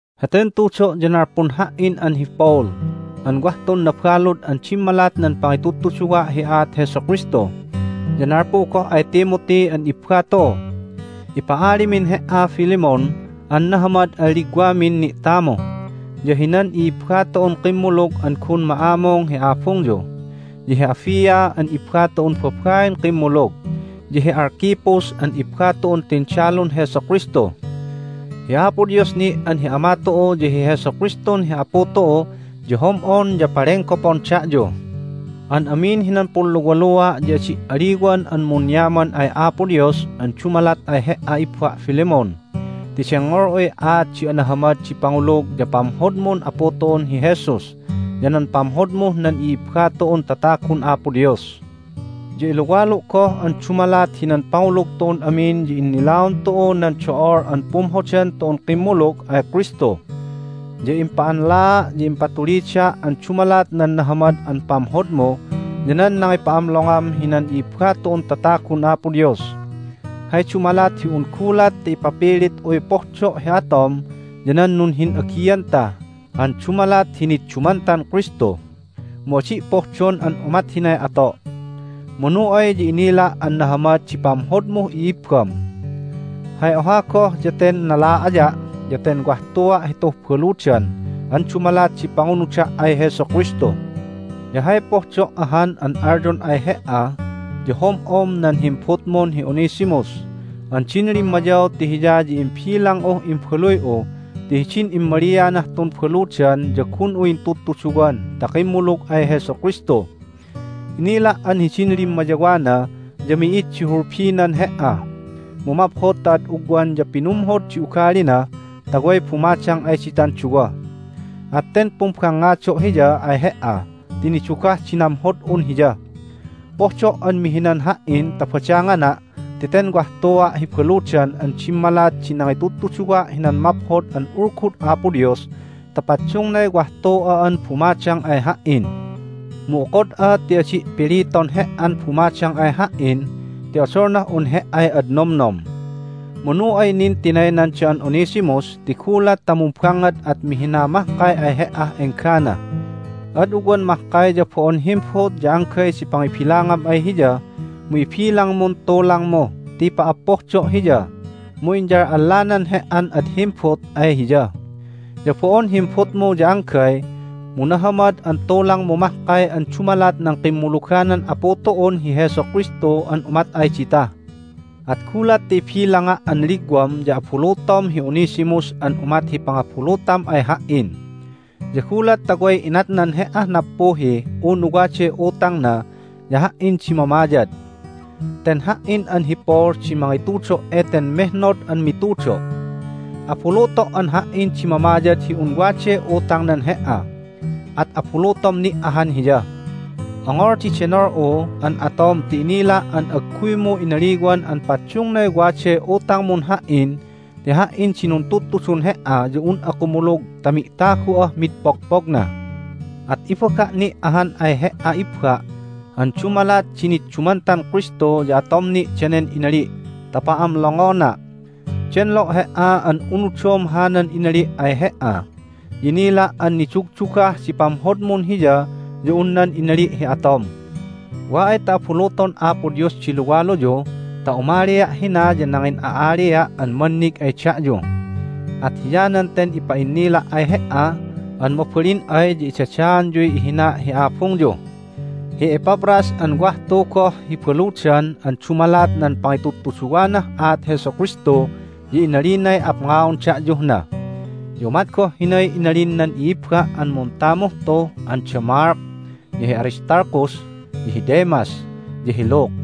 Heten tudo' ya nalpun ha"in an hi Paul an wah tun nabalud an dimmalat nan pangitudtuduwa' hi aat Jesu Kristu, ya nalpu goh ay Timothy an ibba tu'u. Ipa'alimin he"a, Philemon, an nahamad an ligwamin ni'tamu, ya hinan i'ibba tu'un kimmulug an gun ma'amung hi abungyu, ya hi Apphia an ibba tu'un babain kimmulug, ya hi Archippus an ibba tu'un tindalun Jesu Kristu. Hi Apo Dios ni' an hi Ama tu'u ya hi Jesu Kristun hi Apu tu'u ya hom'on ya palenggopon da'yu. An amin hinan punluwalua' ya adi' aliwan an munyaman ay Apo Dios an dumalat ay he"a, ibba' Philemon, ti dengngol'uy aat di anahamad di pangulug ya pamhodmun Apu tu'un hi Jesus ya nan pamhodmuh nan i'ibba tu'un tatagun Apo Dios. Ya iluwalu' goh an dumalat hinan pangulug tu'un amin ya innilaon tu'u nan do'ol an pumhodan tu'un kimmulug ay Kristu. Ya impa'anlaa' ya impatulida' an dumalat nan nahamad an pamhodmu ya nan nangipa'amlongam hinan i'ibba tu'un tatagun Apo Dios. Hay dumalat hi un gulat ta ipapilit'uy pohdo' hi atom ya nan nunhin'agianta an dumalat hi niddumantan Kristu, mu adi' pohdon an umat hinay ato'. Manu ay ya inila' an nahamad di pamhodmuh i'ibbam. Hay oha goh ya ten nala'aya' ya ten wah tua' hituh baludan an dumalat di pangunuda' ay Jesu Kristu, ya hay pohdo' ahan an alyon ay he"a ya hom'om nan himbutmun hi Onesimus an din limmayaw ti hiya ya imbilang'uh imbaluy'u ti hidin immalianah tun baludan ya gun'u intudtuduwan ta kimmulug ay Jesu Kristu. Inila' an hidin limmayawana ya mi'id di hulbinan he"a, mu maphod ta ad ugwan ya pinumhod di ugalina ta way bumadang ay ditan duwa. At ten pumbangngado' hiya ay he"a ti nidugah di namhod'un hiya. Pohdo' an mihinan ha"in ta badangana' ti ten wah tua' hi baludan an dimmalat di nangitudtuduwa' hinan Maphod an Ulgud Apo Dios ta paddungnay wah tu'a an bumadang ay ha"in. Mu okod'a ti adi' piliton he"an bumadang ay ha"in ti odolnah un he"ay ad nomnom. Manu ay nin tinaynan da'an Onesimus ti gulat ta mumbangngad at mihina mahkay ay he"ah enggana! Ad ugwan mahkay ya bo'on himbut ya anggay di pangibilangam ay hiya, mu ibilangmun tulangmu ti pa"appohdo' hiya, mu inyal'allanan he"an ad himbut ay hiya. Ya bo'on himbutmu ya anggay, mu nahamad an tulangmu mahkay an dumalat nan kimmuluganan Apu tu'un hi Jesu Kristu an umat ay dita. At gulat ta ibilanga' an ligwam ya abuluton hi Onesimus an umat hi pangabulutam ay ha"in! Ya gulat ta way inatnan he"ah nappuhi unu waday utangna ya ha"in di mamayad. Ten ha"in an hi Paul di mangitudo' eten mehnod an mitudo': "Abuluto' an ha"in di mamayad hi un waday utangnan he"a. At abulutom ni' ahan hiya." Ongol di denol'u an atom ti inila' an agguymu inaliwan an paddungnay waday utangmun ha"in ti ha"in di nuntudtudun he"a ya un'a kumulug ta mi'tagu'ah mid pogpogna! At ibaga' ni' ahan ay he"a, ibba', an dumalat di niddumantan Kristu ya atom ni' danen inali' ta pa'amlongona'. Denlo' he"a an unudom hanan inali' ay he"a, ya inila' an nidugdugah di pamhodmun hiya ya un nan inali' hi atom. Wa ay ta abuluton Apo Dios di luwaluyu ta umalia' hina ya nangin'a'alia' an mannig ay da'yu. At hiyanan ten ipa'innila' ay he"a an mabalin ay ya idadaanyuy ihina' hi abungyu. Hi Epaphras an wah tu goh hi baludan an dumalat nan pangitudtuduwanah aat Jesu Kristu ya inalinay apngaon da'yuh na. Ya umat goh hinay inalin nan i'ibba' an muntamuh tu an da Mark, ya hi Aristarchus, ya hi Demas, ya hi Luke.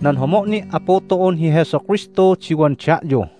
Nan homo' ni' Apu tu'un hi Jesu Kristu di wan da'yu.